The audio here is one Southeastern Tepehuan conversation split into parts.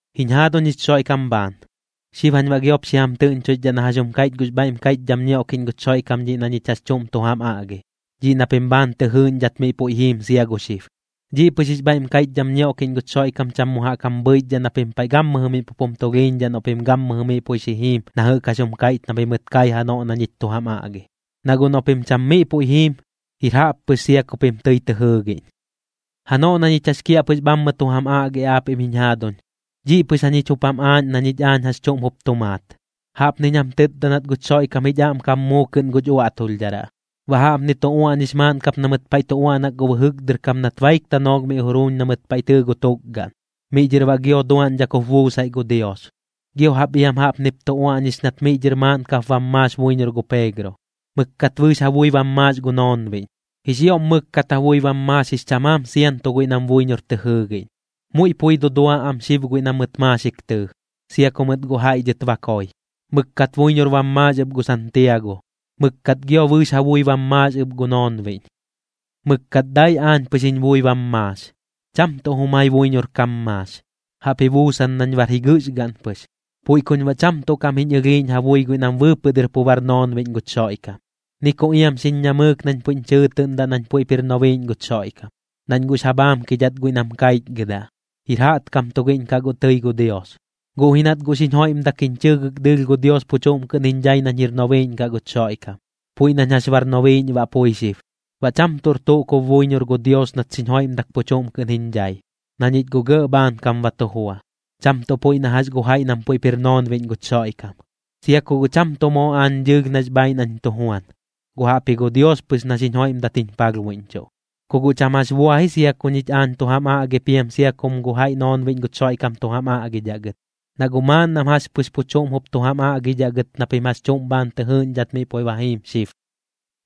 Jiñ jaaduñ jich Xoiꞌkam bhaan, xib jañ baꞌ giop xi jam tɨꞌñchoixdhaꞌ na jax jum kaiꞌch gux bhaiꞌm kaiꞌchdham ñioꞌkiꞌñ guch Xoiꞌkam dhiꞌ na ñich jax chuꞌm tu jam aꞌgi, dhiꞌ na pim bhaan tɨ jɨɨꞌñdhat miꞌ puiꞌ jiim sia gu xib. Dhiꞌ pɨx jix bhaiꞌm kaiꞌchdham ñioꞌkiꞌñ guch Xoiꞌkam cham mu jaꞌk jam bhɨichdhaꞌ na pim paiꞌ gammɨjɨ miꞌ pup jum tulhiiñdhaꞌ noꞌ pim gammɨjɨ miꞌ puiꞌ xi jiim na jɨꞌk jax jum kaiꞌch na pimɨt kai janoꞌ na ñich tu jam aꞌgi. Na guꞌ noꞌ pim cham miꞌ puiꞌ jiim, jir jaꞌp pɨx sia ku pim tɨi tɨ jɨɨgiꞌñ. Janoꞌ na ñich jax kiaꞌpɨx bhammɨ tu jam aꞌgi aapiꞌm jiñ jaaduñ, dhiꞌ pɨx jañich jup jam aaꞌñ na ñich aañ jax chuꞌm jup tu maat. Jaꞌpniñ jam tɨtda nat guch Xoiꞌkam jich aꞌmkam muu kɨꞌn guch uaꞌtulhdharaꞌ. Baꞌ jaꞌpni tu uaꞌñix maaꞌn kap na mɨt paiꞌ tu uaꞌnak gu bɨjɨk dɨr kam nat baik tanoolh miꞌ juruuñ na mɨt paiꞌ tɨɨ gu tukgaꞌn, miꞌ dhɨr baꞌ gio duaꞌñdhak jup buusaiꞌ gu Dios. Gio jaꞌp iam jaꞌpnip tu uaꞌñix nat miꞌ dhɨr maaꞌn kap bam maax buiñor gu Peegro, mɨkkat bɨɨx ja bui bam maax gu noonbiꞌñ. Jix ioꞌm mɨkkat ja bui bam maax jix chamaam sianto guiꞌ nam buiñor tɨ jɨɨgiꞌñ. Muiꞌ pui dudua am xib guiꞌ na mɨt maaxik tɨɨ, sia ku mɨt guꞌ jaiꞌ dhɨt ba koi. Mɨkkat buiñor bam maax ɨp gu Santiago, mɨkkat gio bɨɨx ja bui bam maax ɨp gu noonbiꞌñ. Mɨkkat dai aañ pɨx jiñ bui bam maax, cham tuꞌ jumai buiñor kam maax, jaꞌp ji buusan nañ bar jigɨɨx gaꞌn pɨx. Puiꞌ kuñ baꞌ cham tuꞌ kaꞌm jiñ ɨlhiiꞌñ ja bui guiꞌ nam bɨɨpɨꞌ dɨr pu bar noonbiꞌñ guch Xoiꞌkam, ni ku iam xiñ ñamɨɨk nañ puiꞌñ chɨɨtɨꞌndaꞌ nañ puiꞌp jir nobiiꞌñ guch Xoiꞌkam, nañ guꞌx ja bhaamkidhat guiꞌ nam kaichgɨdaꞌ, jir jaꞌtkam tugiꞌñ kaꞌ guꞌ tɨi gu Dios. Guꞌ ji nat guꞌ xiñ joiꞌmdak jiñ chɨɨgɨk dɨɨlh gu Dios pu chuꞌm kɨꞌn jiñ dhai nañ jir nobiiꞌñ kaꞌ guch Xoiꞌkam, puiꞌ nañ jax bar nobiiꞌñ baꞌ pui xib. Baꞌ cham tuꞌr tuꞌ kub buiñor gu Dios nat xiñ joiꞌmdak pu chuꞌm kɨꞌn jiñ dhai, na ñich guꞌ gɇꞌ bhaankam ba tu jua, cham tuꞌ puiꞌ na jax gu jaiꞌ nam jup jir noonbiꞌñ guch Xoiꞌkam. Sia ku guꞌ cham tuꞌ moo aañ dɨɨlh nax bhaaiꞌ nañ tu juan, guꞌ jaꞌpji gu Dios pɨx na xiñ joiꞌmdat jiñ palhbuiꞌñchuꞌ. Ku guꞌ cham jax bua ji sia ku ñich aañ tu jam aꞌgi piam sia kum gu jaiꞌ noonbiꞌñ guch Xoiꞌkam tu jam aꞌgidhaꞌ gɨt, na guꞌ maaꞌn nam jax pɨx pu chuꞌm jup tu jam aꞌgidhaꞌ gɨt na pim jax chuꞌm bhaan tɨ jɨɨꞌñdhat miꞌ puiꞌ ba jiim xib.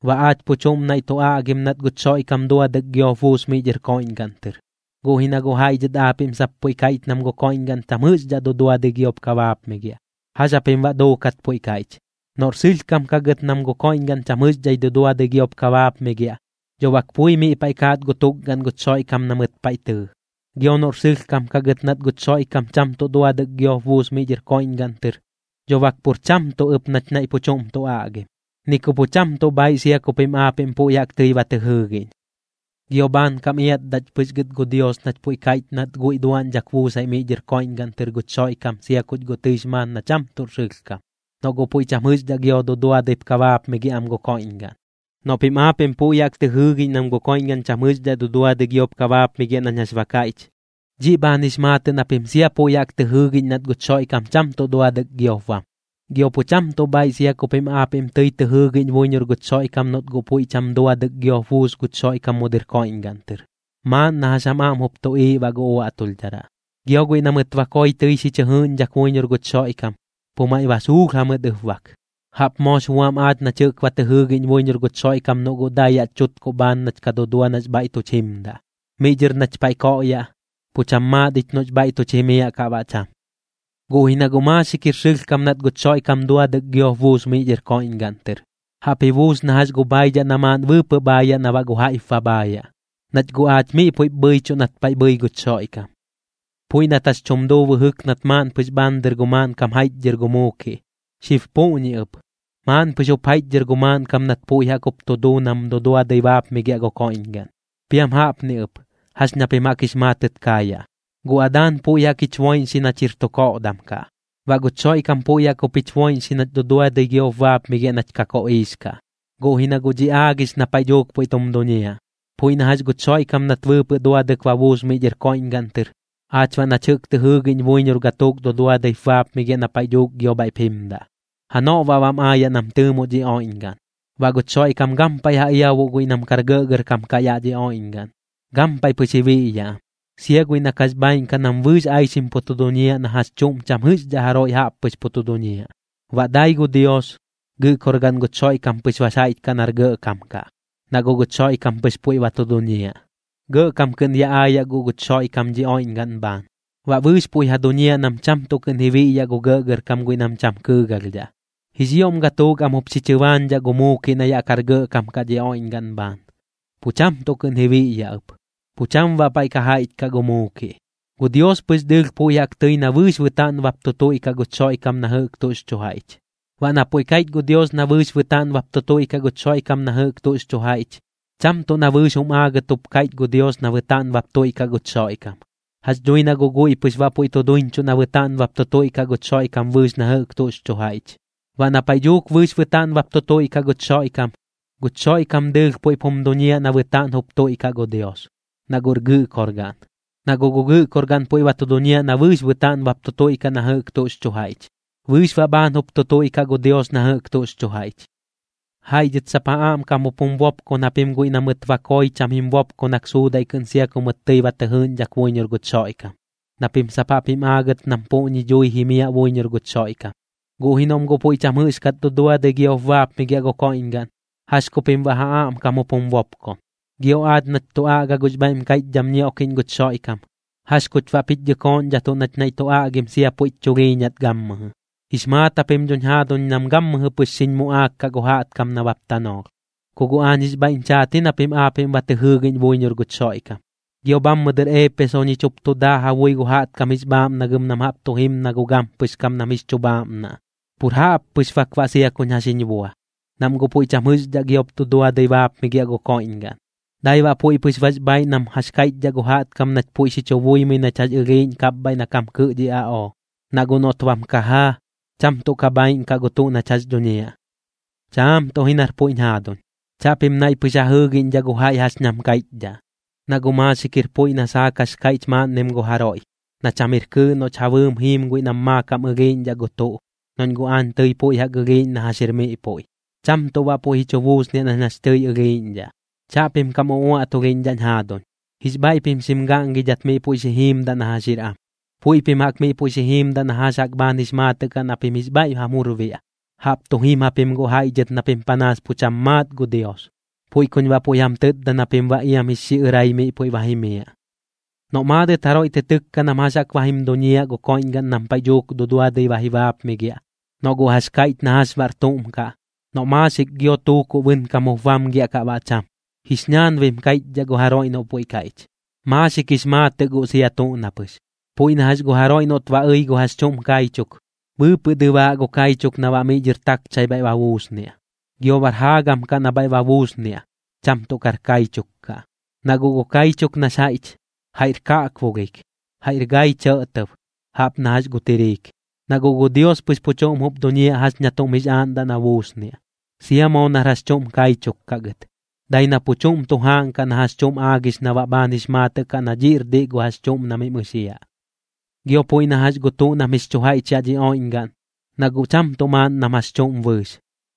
Baꞌ aach pu chuꞌm naiꞌ tu aꞌgim nat guch Xoiꞌkam duadɨk giop buus miꞌ dhɨr koiꞌñgaꞌn tɨr, guꞌ ji na guꞌ jaiꞌ dhɨt aapiꞌm sap puiꞌ kaiꞌch nam gu koiꞌñgaꞌn cham jɨꞌxdhaꞌ duduadɨi giop ka baapmigiaꞌ. ¿Jax japim baꞌ duukat puiꞌ kaiꞌch? Noꞌr sɨlhkam kaꞌ gɨt nam gu koiꞌñgaꞌn cham jɨꞌxdhaꞌ duduadɨi giop ka baapmigiaꞌ, dho bak pui miꞌ paiꞌ kaat gu tukgaꞌn guch Xoiꞌkam na mɨt paiꞌ tɨɨ. Gio noꞌr sɨlhkam kaꞌ gɨt nat guch Xoiꞌkam cham tuꞌ duadɨk giop buus miꞌ dhɨr koiꞌñgaꞌn tɨr, dho bak pur cham tuꞌ ɨp nach naiꞌ pu chuꞌm tu aꞌgim, ni ku pu cham tuꞌ bhaaiꞌ sia ku pim aapiꞌm puiꞌ jaꞌk tɨi ba tɨ jɨɨgiꞌñ. Gio bhaankam iatdaꞌch pɨx gɨt gu Dios nach puiꞌ kaiꞌch nat guiꞌ duaꞌñdhak buusaiꞌ miꞌ dhɨr koiꞌñgaꞌn tɨr guch Xoiꞌkam sia kuch guꞌ tɨix maat na cham tuꞌr sɨlhkam, noꞌ guꞌ puiꞌ cham jɨꞌxdhaꞌ giop duduadɨi ka baapmigiaꞌ am gu koiꞌñgaꞌn. Noꞌ pim aapiꞌm puiꞌ jaꞌk tɨ jɨɨgiꞌñ nam gu koiꞌñgaꞌn cham jɨꞌxdhaꞌ duduadɨi giop ka baapmigiaꞌ nañ jax ba kaiꞌch, dhiꞌ bhaan jix maatɨꞌ na pim sia puiꞌ jaꞌk tɨ jɨɨgiꞌñ nat guch Xoiꞌkam cham tuꞌ duadɨk giop bam. Gio pu cham tuꞌ bhaaiꞌ sia ku pim aapiꞌm tɨi tɨ jɨɨgiꞌñ buiñor guch Xoiꞌkam noꞌt guꞌ puiꞌ cham duadɨk giop buus guch Xoiꞌkam mu dɨr koiꞌñgaꞌn tɨr, maaꞌn na jax jam aꞌm jup tuꞌiiꞌ baꞌ gu uaꞌtulhdharaꞌ. Gio guiꞌ na mɨt ba koi tɨi xi chɨ jɨɨꞌñdhak buiñor guch Xoiꞌkam, pu maiꞌ ba suulh jamɨt ɨp bak. Jaꞌp moox buam aach nach jɨꞌk tɨi ba tɨ jɨɨgiꞌñ buiñor guch Xoiꞌkam noꞌ guꞌ dai yaꞌch chutkuꞌ bhaan nach ka dudua nax bhaiꞌ tuch jimdaꞌ, miꞌ dhɨr nach paiꞌ koꞌyaꞌ, pu cham maat ich noꞌx bhaiꞌ tuch jimiaꞌ kaꞌ baꞌ cham. Guꞌ ji na guꞌ maaxik jir sɨlhkam nat guch Xoiꞌkam duduadɨk giop buus miꞌ dhɨr koiꞌñgaꞌn tɨr. Jaꞌp ji buus na jax gu bhaidhaꞌ na maaꞌn bɨɨpɨꞌ bhaayaꞌ na baꞌ gu jaiꞌp ba bhaayaꞌ, nach guꞌ aach miꞌ puiꞌp bhɨichuꞌ nat paiꞌ bhɨi guch Xoiꞌkam. Puiꞌ nat jax chum duu bɨjɨk nat maaꞌn pɨx bhaan dɨr gu maaꞌnkam jaiꞌchdhɨr gu muukiꞌ, xib puꞌñi ɨp, maaꞌn pɨx jup jaiꞌchdhɨr gu maaꞌnkam nat puiꞌ jaꞌk jup tu duu nam duduadɨi baapmigiaꞌ gu koiꞌñgaꞌn. Piam jaꞌpni ɨp, jax ña pim jaꞌk jix maatɨt kaayaꞌ: Gu Adaan puiꞌ jaꞌk jich boiꞌñxi nach jir tu koꞌdam kaꞌ, baꞌ guch Xoiꞌkam puiꞌ jaꞌk jup jich boiꞌñxi nach duduadɨi giop baapmigiaꞌ nach ka koꞌiix kaꞌ. Guꞌ ji na guꞌ dhiꞌ aagix na paiꞌ dhuuk puiꞌ tum duñiaꞌ, puiꞌ na jax guch Xoiꞌkam nat bɨɨpɨꞌ duadɨk ba buus miꞌ dhɨr koiꞌñgaꞌn tɨr, aach baꞌ nach jɨꞌk tɨ jɨɨgiꞌñ buiñor gatuuk duduadɨip baapmigiaꞌ na paiꞌ dhuuk gio bhaiꞌp jimdaꞌ. Janoꞌ baꞌ bam aayaꞌ nam tɨɨmoꞌ dhi oiꞌñgaꞌn, baꞌ guch Xoiꞌkam gampaiꞌ ja iabuꞌ guiꞌ nam kar gɇꞌgɇrkam kaꞌ yaꞌ dhi oiꞌñgaꞌn, gampaiꞌ pɨx ji biꞌyaꞌ am, sia guiꞌ na kax bhaaiꞌn kaꞌ nam bɨɨx aixim pu tu duñiaꞌ na jax chuꞌm cham jɨꞌxdhaꞌ jaroiꞌ jaꞌp pɨx pu tu duñiaꞌ. Baꞌ dai gu Dios, Gɨꞌkorgaꞌn guch Xoiꞌkam pɨx bax jaiꞌch kaꞌ nar gɇꞌkam kaꞌ, na guꞌ guch Xoiꞌkam pɨx puiꞌ ba tu duñiaꞌ. Gɇꞌkam kɨꞌn ya aayaꞌ guꞌ guch Xoiꞌkam dhi oiꞌñgaꞌn bhaan, baꞌ bɨɨx puiꞌ ja duñiaꞌ nam cham tuꞌ kɨꞌn ji biꞌyaꞌ gu gɇꞌgɇrkam guiꞌ nam cham kɨɨgalhdhaꞌ. Jix ioꞌm gatuuk am jup xi chɨbaañdhaꞌ gu muukiꞌ na yaꞌ kar gɇꞌkam kaꞌ dhi oiꞌñgaꞌn bhaan, pu cham tuꞌ kɨꞌn ji biꞌyaꞌ ɨp, pu cham baꞌ paiꞌ ka jaiꞌch kaꞌ gu muukiꞌ. Gu Dios pɨx dɨɨlh puiꞌ jaꞌk tɨi na bɨɨx bɨtaaꞌn bap tu tuiꞌkaꞌ guch Xoiꞌkam na jɨꞌk tuꞌx chu jaiꞌch. Baꞌ na puiꞌ kaiꞌch gu Dios na bɨɨx bɨtaaꞌn bap tu tuiꞌkaꞌ guch Xoiꞌkam na jɨꞌk tuꞌx chu jaiꞌch, cham tuꞌ na bɨɨx jum aagɨt jup kaiꞌch gu Dios na bɨtaaꞌn bap tuiꞌkaꞌ guch Xoiꞌkam. Jax dhui na guꞌ guiꞌ pɨx baꞌ puiꞌ tu duiñchuꞌ na bɨtaaꞌn bap tu tuiꞌkaꞌ guch Xoiꞌkam bɨɨx na jɨꞌk tuꞌx chu jaiꞌch. Baꞌ na paiꞌ dhuuk bɨɨx bɨtaaꞌn bap tu tuiꞌkaꞌ guch Xoiꞌkam, guch Xoiꞌkam dɨɨlh puiꞌp jum duñiaꞌ na bɨtaaꞌn jup tuiꞌkaꞌ gu Dios, na guꞌr Gɨꞌkorgaꞌn. Na guꞌ gu Gɨꞌkorgaꞌn puiꞌ ba tu duñiaꞌ na bɨɨx bɨtaaꞌn bap tu tuiꞌkaꞌ na jɨꞌk tuꞌx chu jaiꞌch, bɨɨx baꞌ bhaan jup tu tuiꞌkaꞌ gu Dios na jɨꞌk tuꞌx chu jaiꞌch. Jaiꞌ dhɨt sap ja aꞌmkam jup jum bopkon japim guiꞌ na mɨt ba koi cham jim bopkonak suudaiꞌ kɨꞌn sia ku mɨt tɨi ba tɨ jɨɨꞌñdhak buiñor guch Xoiꞌkam, na pim sap jaꞌp jim aagɨt nam puꞌñi dhui jimiaꞌ buiñor guch Xoiꞌkam. Guꞌ ji noꞌm guꞌ puiꞌ cham jɨꞌxkat duduadɨi giop baapmigiaꞌ gu koiꞌñgaꞌn, ¿jax ku pim baꞌ ja aꞌmkam jup jum bopkon? Gio aach nach tu aꞌga gux bhaiꞌm kaiꞌchdham ñioꞌkiꞌñ guch Xoiꞌkam, ¿jax kuch baꞌp jich dhɨkooꞌñdhatuꞌ nach naiꞌ tu aꞌgim sia puiꞌch chulhiiñat gammɨjɨ? Jix maat japim dhoñ jaaduñ nam gammɨjɨ pɨx xiñ muꞌaak kaꞌ gu jaꞌtkam nabap tanoolh, ku guꞌ aañ jix bhaiꞌñ chaat ji na pim aapiꞌm ba tɨ jɨɨgiꞌñ buiñor guch Xoiꞌkam. Gio bhammɨ dɨr Eepeso ñich jup tu daa ja bui gu jaꞌtkam jix bhaaꞌmnagɨm nam jaꞌp tu jim na gu gampɨx kam nam jix chu bhaaꞌmnaꞌ. Pur jaꞌp pɨx bak baꞌ sia kuñ jax jiñ bua, nam guꞌ puiꞌ cham jɨꞌxdhaꞌ giop duduadɨi baapmigiaꞌ gu koiꞌñgaꞌn, dai baꞌ puiꞌ pɨx bax bhaaiꞌ nam jax kaiꞌchdhaꞌ gu jaꞌtkam nach puiꞌ xi chu buimɨi nach jax ɨlhiiꞌñ na kapbhaiꞌ kam kɨɨꞌ dhi aꞌoo. Na guꞌ noꞌt bam kajaa, cham tuꞌ ka bhaaiꞌn kaꞌ gu tuꞌ nach jax dhuñiaꞌ. Chaam tuꞌ ji nar puiꞌñ jaaduñ, chaꞌpim naiꞌ pɨx ja jɨɨgiꞌñdhaꞌ gu jaiꞌ jax nam kaiꞌchdhaꞌ. Na guꞌ maaxik jir puiꞌ na saak jax kaiꞌch maaꞌnnim gu jaroiꞌ, na cham jir kɨɨꞌ noꞌch ja bɨɨm jiim guiꞌ nam maakam ɨlhiiꞌñdhaꞌ gu tuꞌ, noꞌñ guꞌ aañ tɨi puiꞌ jaꞌk ɨlhiiꞌñ na jax jir miꞌ puiꞌ, cham tuꞌ baꞌ puiꞌ ji chu buusniaꞌ nañ jax tɨi ɨlhiiꞌñdhaꞌ. Chaꞌpim kam uaꞌtulhiꞌñdhaꞌñ jaaduñ. Jix bhaiꞌ pim xim gaꞌngidhat miꞌ puiꞌ xi jiimdaꞌ na jax jir am, puiꞌ pim jaꞌk miꞌ puiꞌ xi jiimdaꞌ na jax jaꞌk bhaan jix maatɨꞌ kaꞌ na pim jix bhaiꞌ jam jur biaꞌ. Jaꞌp tu jim japim guꞌ jaiꞌ dhɨt na pim panaas pu cham maat gu Dios, puiꞌ kuñ baꞌ puiꞌ jam tɨtda na pim baꞌ iam jix xiꞌɨrai miꞌ puiꞌ ba jimiaꞌ. Noꞌ maadɨt jaroiꞌ tɨ tɨkka nam jax baꞌ jaꞌk ba jim duñiaꞌ gu koiꞌñgaꞌn nam paiꞌ dhuuk duduadɨi ba ji baapmigiaꞌ, noꞌ guꞌ jax kaiꞌch na jax baꞌr tuꞌm kaꞌ, noꞌ maaxik gio tuukuꞌ bɨnkam jup bamgiaꞌ kaꞌ baꞌ cham, jix ñaanbim kaiꞌchdhaꞌ gu jaroiꞌ noꞌ puiꞌ kaiꞌch, maaxik jix maatɨꞌ guꞌ sia tuꞌ na pɨx. Puiꞌ na jax gu jaroiꞌ noꞌt ba ɨi gu jax chuꞌm kaichuk, bɨɨpɨꞌ dɨbaaꞌ gu kaichuk na baꞌ miꞌ dhɨr takchai bhaiꞌ ba buusniaꞌ. Gio bar jaagam kaꞌ na bhaiꞌ ba buusniaꞌ, cham tuꞌ kar kaichuk kaꞌ. Na guꞌ gu kaichuk nax jaiꞌch, jaiꞌr kaꞌkbulhik, jaiꞌr gai chɇꞌtɇb jaꞌp na jax gu tiriik. Na guꞌ gu Dios pɨx pu chuꞌm jup duñiaꞌ jax ña tuꞌm jix aaꞌndaꞌ na buusniaꞌ, sia moo nar jax chuꞌm kaichuk kaꞌ gɨt, dai na pu chuꞌm tu jaaꞌnkaꞌ na jax chuꞌm aagix na baꞌ bhaan jix maatɨꞌ kaꞌ na dhiꞌr diꞌ gu jax chuꞌm na mim ɨxiaꞌ. Gio puiꞌ na jax gu tuꞌ nam jix chu jaiꞌch yaꞌ dhi oiꞌñgaꞌn, na guꞌ cham tuꞌ maaꞌn nam jax chuꞌm bɨɨx.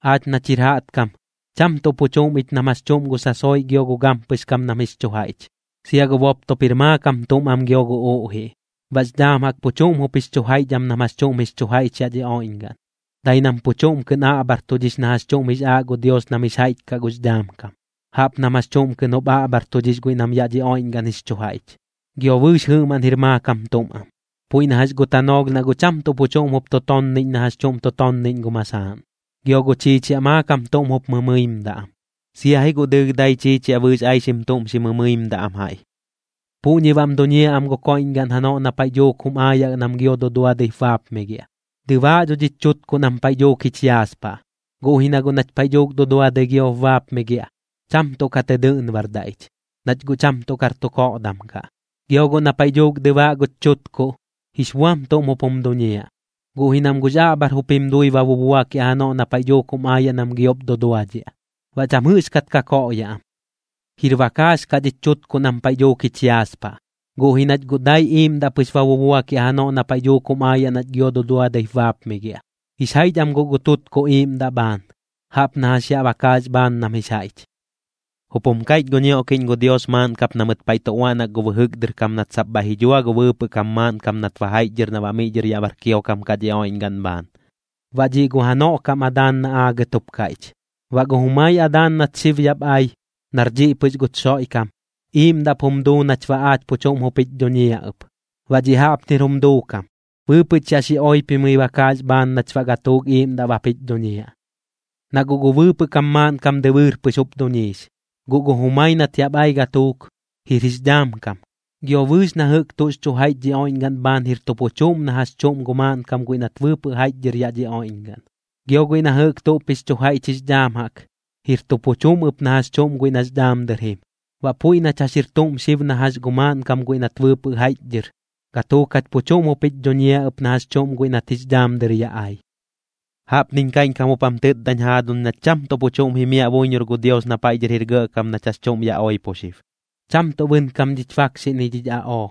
Aach nach jir jaꞌtkam, cham tuꞌ pu chuꞌm ich nam jax chuꞌm gu sasoiꞌ gio gu gampɨx kam nam jix chu jaiꞌch. Sia gu boptop jir maakam tuꞌm am gio gu uꞌjiꞌ. Baꞌx dhaam jaꞌk pu chuꞌm jup jix chu jaiꞌch am nam jax chuꞌm jix chu jaiꞌch yaꞌ dhi oiꞌñgaꞌn, dai nam pu chuꞌm kɨꞌn aꞌbhartudhix na jax chuꞌm jix aaꞌ gu Dios nam jix jaiꞌch kaꞌ gux dhaam kam, jaꞌp nam jax chuꞌm kɨꞌn jup aꞌbhartudhix guiꞌ nam yaꞌ dhi oiꞌñgaꞌn jix chu jaiꞌch. Gio bɨɨx jɨꞌmaꞌn jir maakam tuꞌm am, puiꞌ na jax gu tanoolh na guꞌ cham tuꞌ pu chuꞌm jup tu tonniꞌñ na jax chuꞌm tu tonniꞌñ gu masaaꞌn, gio gu chiichiaꞌ maakam tuꞌm jup mɨmɨimdaꞌ am, sia ji guꞌ dɨɨlh dai chiichiaꞌ bɨɨx aixim tuꞌm xi mɨmɨimdaꞌ am jaiꞌ. Puꞌñi baꞌm duñiaꞌ am gu koiꞌñgaꞌn janoꞌ na paiꞌ dhuuk jum aayaꞌ nam gio duduadɨip baapmigiaꞌ. Dɨbaaꞌ dho dhich chutkuꞌ nam paiꞌ dhuuk jich yaaspaꞌ. Guꞌ ji na guꞌ nach paiꞌ dhuuk duduadɨi giop baapmigiaꞌ, cham tuꞌ ka tɨ dɨꞌnbardaꞌ ich, nach guꞌ cham tuꞌ kar tu koꞌdam kaꞌ. Gio guꞌ na paiꞌ dhuuk dɨbaaꞌ guch chutkuꞌ, jix buam tuꞌm jup jum duñiaꞌ, guꞌ ji nam guꞌx aꞌbhar jup jim dui ba bubuakiaꞌ janoꞌ na paiꞌ dhuuk jum aayaꞌ nam giop duduadhiaꞌ, baꞌ cham jɨꞌxkat ka koꞌyaꞌ am. Jir bakaax kaꞌ dhich chutkuꞌ nam paiꞌ dhuuk jich yaaspaꞌ, guꞌ ji nach guꞌ dai iiꞌmdaꞌ pɨx ba bubuakiaꞌ janoꞌ na paiꞌ dhuuk jum aayaꞌ nach gio duduadɨip baapmigiaꞌ. Jix jaiꞌch am guꞌ gu tutkuꞌ iiꞌmdaꞌ bhaan, jaꞌp na jax yaꞌ bakaax bhaan nam jix jaiꞌch. Jup jum kaiꞌch gu ñioꞌkiꞌñ gu Dios maaꞌn kap na mɨt paiꞌ tu uaꞌnak gu bɨjɨk dɨr kam nat sap bhaiꞌ ji dhua gu bɨɨpɨꞌ kam maaꞌnkam nat ba jaiꞌchdhɨr na baꞌ miꞌ dhɨr yaꞌ bar kiokam kaꞌ dhi oiꞌñgaꞌn bhaan, baꞌ dhiꞌ gu janoꞌ kam Adaan na aagɨt jup kaiꞌch. Baꞌ gu jumai Adaan nat xib yaꞌp ai, nar dhiꞌ pɨx guch Xoiꞌkam, iiꞌmdaꞌp jum duu nach baꞌ aach pu chuꞌm jup jich dhuñiaꞌ ɨp. Baꞌ dhiꞌ jaꞌpnir jum duukam: Bɨɨpɨꞌch yaꞌ xi oipimɨi bakaax bhaan nach baꞌ gatuuk iiꞌmdaꞌ bap jich dhuñiaꞌ. Na guꞌ gu bɨɨpɨꞌ kam maaꞌnkam dɨbɨɨr pɨx jup duñiix, guꞌ gu jumai nat yaꞌp ai gatuuk, jir jix dhaam kam. Gio bɨɨx na jɨꞌk tuꞌx chu jaiꞌch dhi oiꞌñgaꞌn bhaan jir tu pu chuꞌm na jax chuꞌm gu maaꞌnkam guiꞌ nat bɨɨpɨꞌ jaiꞌchdhɨr yaꞌ dhi oiꞌñgaꞌn. Gio guiꞌ na jɨꞌk tuꞌp jix chu jaiꞌch jix dhaam jaꞌk, jir tu pu chuꞌm ɨp na jax chuꞌm guiꞌ nax dhaam dɨr jim. Baꞌ puiꞌ nach jax jir tuꞌm xib na jax gu maaꞌnkam guiꞌ nat bɨɨpɨꞌ jaiꞌchdhɨr, gatuuk jach pu chuꞌm jup jich dhuñiaꞌ ɨp na jax chuꞌm guiꞌ nat jix dhaam dɨr yaꞌ ai. Jaꞌpniñ kaiꞌñkam jup jam tɨtdañ jaaduñ nach cham tuꞌ pu chuꞌm jimiaꞌ buiñor gu Dios na paiꞌ dhɨr jir gɇꞌkam nach jax chuꞌm yaꞌ oipo xib, cham tuꞌ bɨnkam dhich bakxiꞌ ni dhich aꞌoo.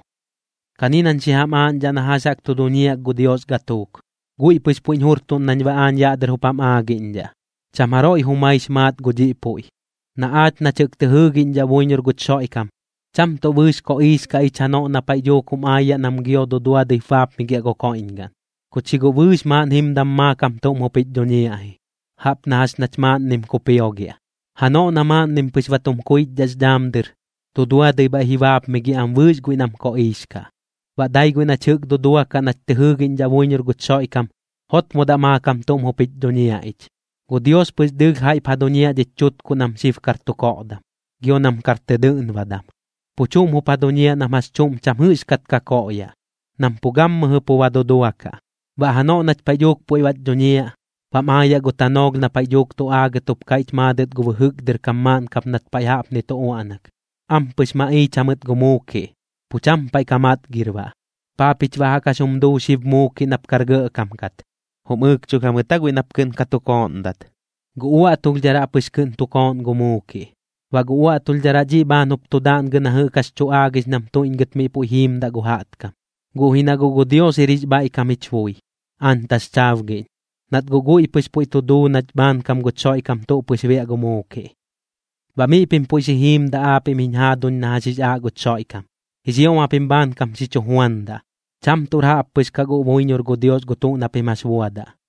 Kani nañ xi jam aaꞌñdhaꞌ na jax jaꞌk tu duñiaꞌ gu Dios gatuuk, guiꞌ pɨx puiꞌñ jurtuꞌn nañ baꞌ aañ yaꞌ dɨr jup jam aagiꞌñdhaꞌ, cham jaroiꞌ jumaix maat gu dhiꞌ puiꞌ: Na aach nach jɨꞌk tɨ jɨɨgiꞌñdhaꞌ buiñor guch Xoiꞌkam, cham tuꞌ bɨɨx koꞌiix kaꞌ ich janoꞌ na paiꞌ dhuuk jum aayaꞌ nam gio duduadɨip baapmigiaꞌ gu koiꞌñgaꞌn, kuch ji guꞌ bɨɨx maaꞌn jimdam maakam tuꞌm jup jich dhuñiaꞌ ji, jaꞌp na jax nach maaꞌnnim kupiogiaꞌ. Janoꞌ na maaꞌnnim pɨx ba tum kuichdhaꞌx dhaam dɨr, duduadɨi bhaiꞌ ji baapmigiaꞌ am bɨɨx guiꞌ nam koꞌiix kaꞌ, baꞌ dai guiꞌ nach jɨꞌk duduakaꞌ nach tɨ jɨɨgiꞌñdhaꞌ buiñor guch Xoiꞌkam, jotmodaꞌ maakam tuꞌm jup jich dhuñiaꞌ ich. Gu Dios pɨx dɨɨlh jaiꞌp ja duñiaꞌ dhich chutkuꞌ nam xib kar tu koꞌdam, gio nam kar tɨ dɨꞌnbadam, pu chuꞌm jup ja duñiaꞌ nam jax chuꞌm cham jɨꞌxkat ka koꞌyaꞌ, nam pu gammɨjɨ pu ba duduakaꞌ. Baꞌ janoꞌ nach paiꞌ dhuuk puiꞌ bach dhuñiaꞌ, bam aayaꞌ gu tanoolh na paiꞌ dhuuk tu aagɨt jup kaiꞌch maadɨt gu bɨjɨk dɨr kam maaꞌn kap nat paiꞌ jaꞌpni tu uaꞌnak: “Ampɨx maꞌiich jamɨt gu muukiꞌ, pu cham paiꞌ ka matgir baꞌ. ¿Paa pich baꞌ jaꞌk jax jum duu xib Muukiꞌ nap kar gɇꞌkam kat? ¿Jum ɨɨkchulh jamɨt aa guiꞌ nap kɨꞌn ka tu kooꞌndat?” Gu uaꞌtulhdharaꞌ pɨx kɨꞌn tu kooꞌn gu muukiꞌ, baꞌ gu uaꞌtulhdharaꞌ dhiꞌ bhaan jup tu daꞌngɨ na jɨꞌk jax tu aagix nam tuiꞌñgɨt miꞌ puiꞌ jiimdaꞌ gu jaꞌtkam. Guꞌ ji na guꞌ gu Dios jir jix bhaiꞌkam jich bui, aañ taxchaabgiꞌñ, nat guꞌ guiꞌ pɨx puiꞌ tu duu nach bhaankam guch Xoiꞌkam tuꞌ pɨx biaꞌ gu muukiꞌ. Baꞌ miꞌ pim puiꞌ xi jiimdaꞌ aapiꞌm jiñ jaaduñ na jax jix aaꞌ guch Xoiꞌkam. Jix ioꞌm japim bhaankam xi chu juandaꞌ, cham tuꞌr jaꞌppɨx kaꞌ guꞌ buiñor gu Dios gu tuꞌ na pim jax buadaꞌ.